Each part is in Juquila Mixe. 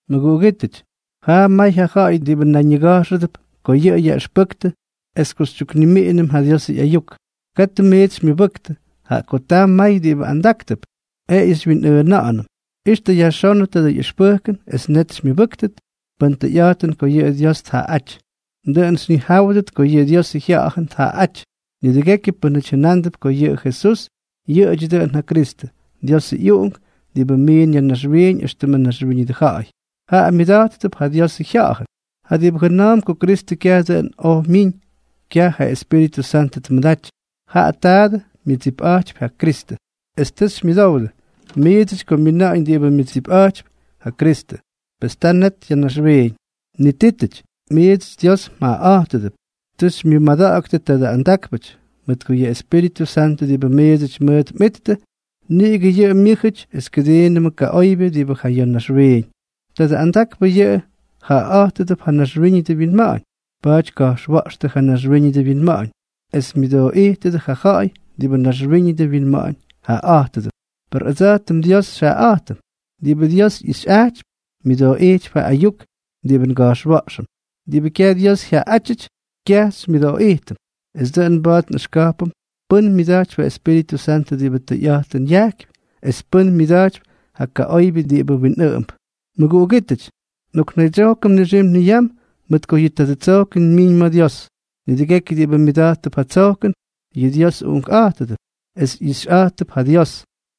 Mʉguꞌugítʉty, jaa may ja ja̱ꞌa̱y diꞌibʉ nayñiga̱jxʉdʉp ko yʉꞌʉ yaꞌʉxpʉktʉ es ko xytyuknimiꞌinʉm ja Diosʉ ꞌyayuk. Katʉ miits xymyʉbʉktʉ, jaꞌa ko taa may diꞌibʉ andáktʉp, jeꞌeyʉ xywyinꞌʉʉna̱ꞌa̱nʉm. Ixtʉ yajxónʉ tadʉ ꞌyʉxpʉjkʉn es net xymyʉbʉ́ktʉt pʉn tʉyꞌa̱jtʉn ko yʉꞌʉ Dios tjaꞌaꞌáty. Dʉꞌʉn xyñijáwʉdʉt ko yʉꞌʉ Diosʉ Jya̱ꞌa̱jʉn tjaꞌaꞌáty: nidʉgekyʉ pʉ́nʉty jʉnándʉp ko yʉ Jesús yʉꞌʉdyʉ dʉꞌʉn ja Kristʉ, Diosʉ ꞌyUꞌunk diꞌibʉ miin ya̱ naxwiiñ éxtʉmʉ naxwíñʉdʉ ja̱ꞌa̱y, jaꞌa myʉda̱jttʉp ja Diosʉ Jya̱ꞌa̱jʉn. Ja diꞌibʉ jʉna̱a̱mp ko Kristʉ kyaj dʉꞌʉn oj myiñ, kyaj ja Espíritʉ Santʉ tmʉdaty, jaꞌa taadʉ myʉdsipꞌa̱jtypy ja Kristʉ. Es tʉ xymyʉdowdʉ miidsʉty ko myina̱ꞌa̱ñ diꞌibʉ myʉdsipꞌa̱jtypy ja Kristʉ. Pes ta net ya̱ naxwiiñ. Nitítʉty, miidsʉty Dios mjaꞌaꞌa̱jtʉdʉp. Tʉ xymyʉmada̱ꞌa̱ktʉ tadʉ andakpʉty, mʉt ko yʉ Espíritʉ Santʉ diꞌibʉ miidsʉty mʉʉt mꞌittʉ, niꞌigʉ yʉꞌʉ myʉ́jʉty es kʉdiinʉmʉ kaꞌoybyʉ diꞌibʉ ja ya̱ naxwiiñ. Tadʉ andakpʉ yʉꞌʉ jaꞌaꞌa̱jtʉdʉp ja naxwíñʉdʉ winma̱ꞌa̱ñ, pa̱a̱ty tka̱jxwa̱ꞌxtʉ ja naxwíñʉdʉ winma̱ꞌa̱ñ, es myʉdooꞌijtʉdʉ ja ja̱ꞌa̱y diꞌibʉ naxwíñʉdʉ winma̱ꞌa̱ñ jaꞌaꞌa̱jtʉdʉp. Per ʉdsa̱jtʉm Dios xyjaꞌaꞌa̱jtʉm. Diꞌibʉ Dios ꞌyijxyꞌajtypy, myʉdooꞌijtypy ja ayuk diꞌibʉ nga̱jxwa̱ꞌxʉm. Per diꞌibʉ kyaj Dios jyaꞌaꞌátyʉty, kyaj xymyʉdooꞌijtʉm. Es dʉꞌʉn mba̱a̱t nꞌʉxka̱jpʉm pʉ́n myʉda̱jtypy ja Espíritʉ Santʉ diꞌibʉ tʉyꞌa̱jtʉn yajkypy, es pʉ́n myʉda̱jtypy ja kaꞌoybyʉ diꞌibʉ winꞌʉꞌʉmp. Mʉguꞌugítʉty, nꞌoknaydsyojkʉm nixim niyam, mʉt ko yʉ tadʉ tsojkʉn myiñ ma̱ Dios. Nidʉgekyʉ diꞌibʉ myʉda̱jttʉp ja tsojkʉn, yʉꞌʉ Dios uꞌunkꞌa̱jtʉdʉp, es ꞌyixyꞌa̱jttʉp ja Dios.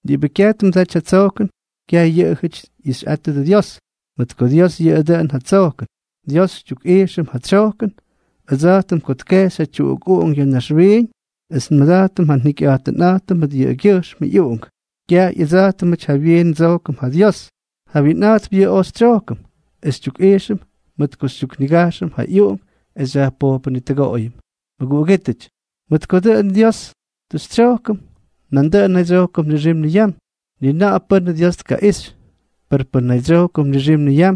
Diꞌibʉ kyaj tmʉdaty ja tsojkʉn, kyaj yʉꞌʉjʉty tꞌixyꞌattʉ Dios, mʉt ko Dios yʉꞌʉ dʉꞌʉn ja tsojkʉn. Dios xytyukꞌijxʉm ja tsyojkʉn ʉdsa̱jtʉm ko tkejxy ja tyuꞌuk Uꞌunk ya̱ naxwiiñ es nmʉda̱jtʉm ja njikyꞌa̱jtʉnꞌa̱jtʉm mʉt yʉꞌʉgyʉjxmʉ ꞌyUꞌunk. Kyaj ꞌyʉdsa̱jtʉmʉty jawyiin ndsojkʉm ja Dios, jawyiinꞌa̱jtp yʉꞌʉ oj xytsyojkʉm es xytyukꞌijxʉm mʉt ko xytyuknigajxʉm ja ꞌyUꞌunk es xyajpojpʉnitʉgoꞌoyʉm. Mʉguꞌugítʉty, mʉt ko dʉꞌʉn ja Dios tʉ xytsyojkʉm, nandʉꞌʉn nnaydsyojkʉm nixim niyam. Ni na̱ꞌa̱ pʉ́nʉ Dios tkaꞌixy. Per pʉn nnaydsyojkʉm nixim niyam,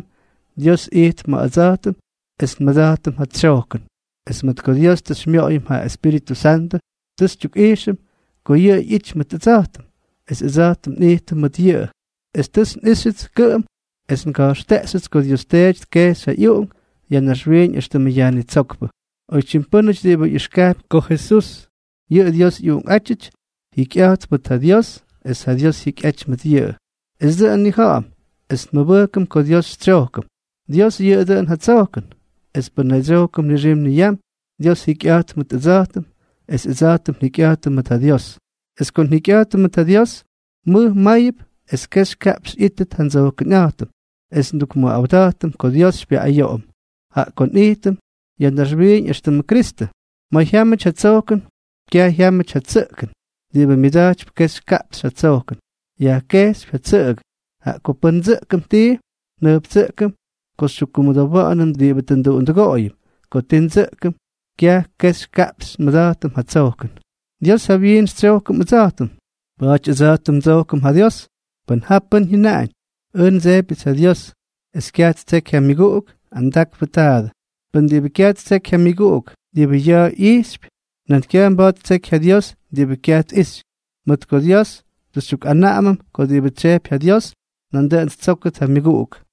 Dios ijtp ma̱ ʉdsa̱jtʉm es nmʉda̱jtʉm ja tsyojkʉn. Es mʉt ko Dios tʉ xymyoꞌoyʉm yʉ Espíritʉ Santʉ, tʉ xytyukꞌijxʉm ko yʉꞌʉ ꞌyity mʉt ʉdsa̱jtʉm, es ʉdsa̱jtʉm nꞌijtʉm mʉt yʉꞌʉ. Es tʉts nꞌíxyʉts kʉꞌʉm es nga̱jxteꞌxyʉts ko Dios Teety tkejxy ja ꞌyUꞌunk ya̱ naxwiiñ éxtʉmʉ Yajnitsókpʉ. Oytyim pʉ́nʉty diꞌibʉ ꞌyijxkajpy ko Jesús yʉꞌʉ Dios ꞌyUꞌunkꞌátyʉty, jikyꞌa̱jtp mʉt ja Dios es ja Dios jyikyꞌaty mʉt yʉꞌʉ. Es dʉꞌʉn nnija̱ꞌa̱m es nmʉbʉjkʉm ko Dios xytsyojkʉm. Dios yʉꞌʉ dʉꞌʉn ja tsojkʉn, es pʉn nnaydsyojkʉm nixim niyam, Dios jikyꞌa̱jtp mʉt ʉdsa̱jtʉm, es ʉdsa̱jtʉm njikyꞌa̱jtʉm mʉt ja Dios. Es ko njikyꞌa̱jtʉm mʉt ja Dios, mʉj máyʉp es kexy kaꞌpxy ꞌyítʉt ja ndsojkʉnꞌa̱jtʉm es ndukmʉꞌawda̱jtʉm ko Dios xypyayoꞌoyʉm, jaꞌa ko nꞌijtʉm ya̱ naxwiiñ éxtʉmʉ Kristʉ. Ma̱ jyámʉty ja tsojkʉn, kyaj jyámʉty ja tsʉꞌkʉn. Diꞌibʉ myʉda̱jtypy kexy kaꞌpxy ja tsojkʉn, yajkekypy ja tsʉꞌʉgʉ. Jaꞌa ko pʉn ndsʉꞌkʉm tii, njʉjptsʉꞌkʉm ko xytyukkumʉdowa̱ꞌa̱nʉm diꞌibʉ tʉ nduꞌundʉgoꞌoyʉm. Ko ti ndsʉꞌkʉm, kyaj kexy kaꞌpxy nmʉda̱jtʉm ja tsojkʉn. Dios jawyiin xytsyojkʉm ʉdsa̱jtʉm. Pa̱a̱ty ʉdsa̱jtʉm ndsojkʉm ja Dios. Pʉn ja pʉ́n jyʉnaꞌañ: “Ʉj ndsejpyʉts ja Dios”, es kyaj ttseky ja myʉguꞌuk, andakpʉ taadʉ. Pʉn diꞌibʉ kyaj ttseky ja myʉguꞌuk diꞌibʉ ya̱a̱ ꞌyijxypy, nan kyaj mba̱a̱t ttseky ja Dios diꞌibʉ kyaj tꞌixy. Mʉt ko Dios tʉ xytyukꞌanaꞌamʉm ko diꞌibʉ tsyejpy ja Dios, nandʉꞌʉn ttsókʉt ja myʉguꞌuk.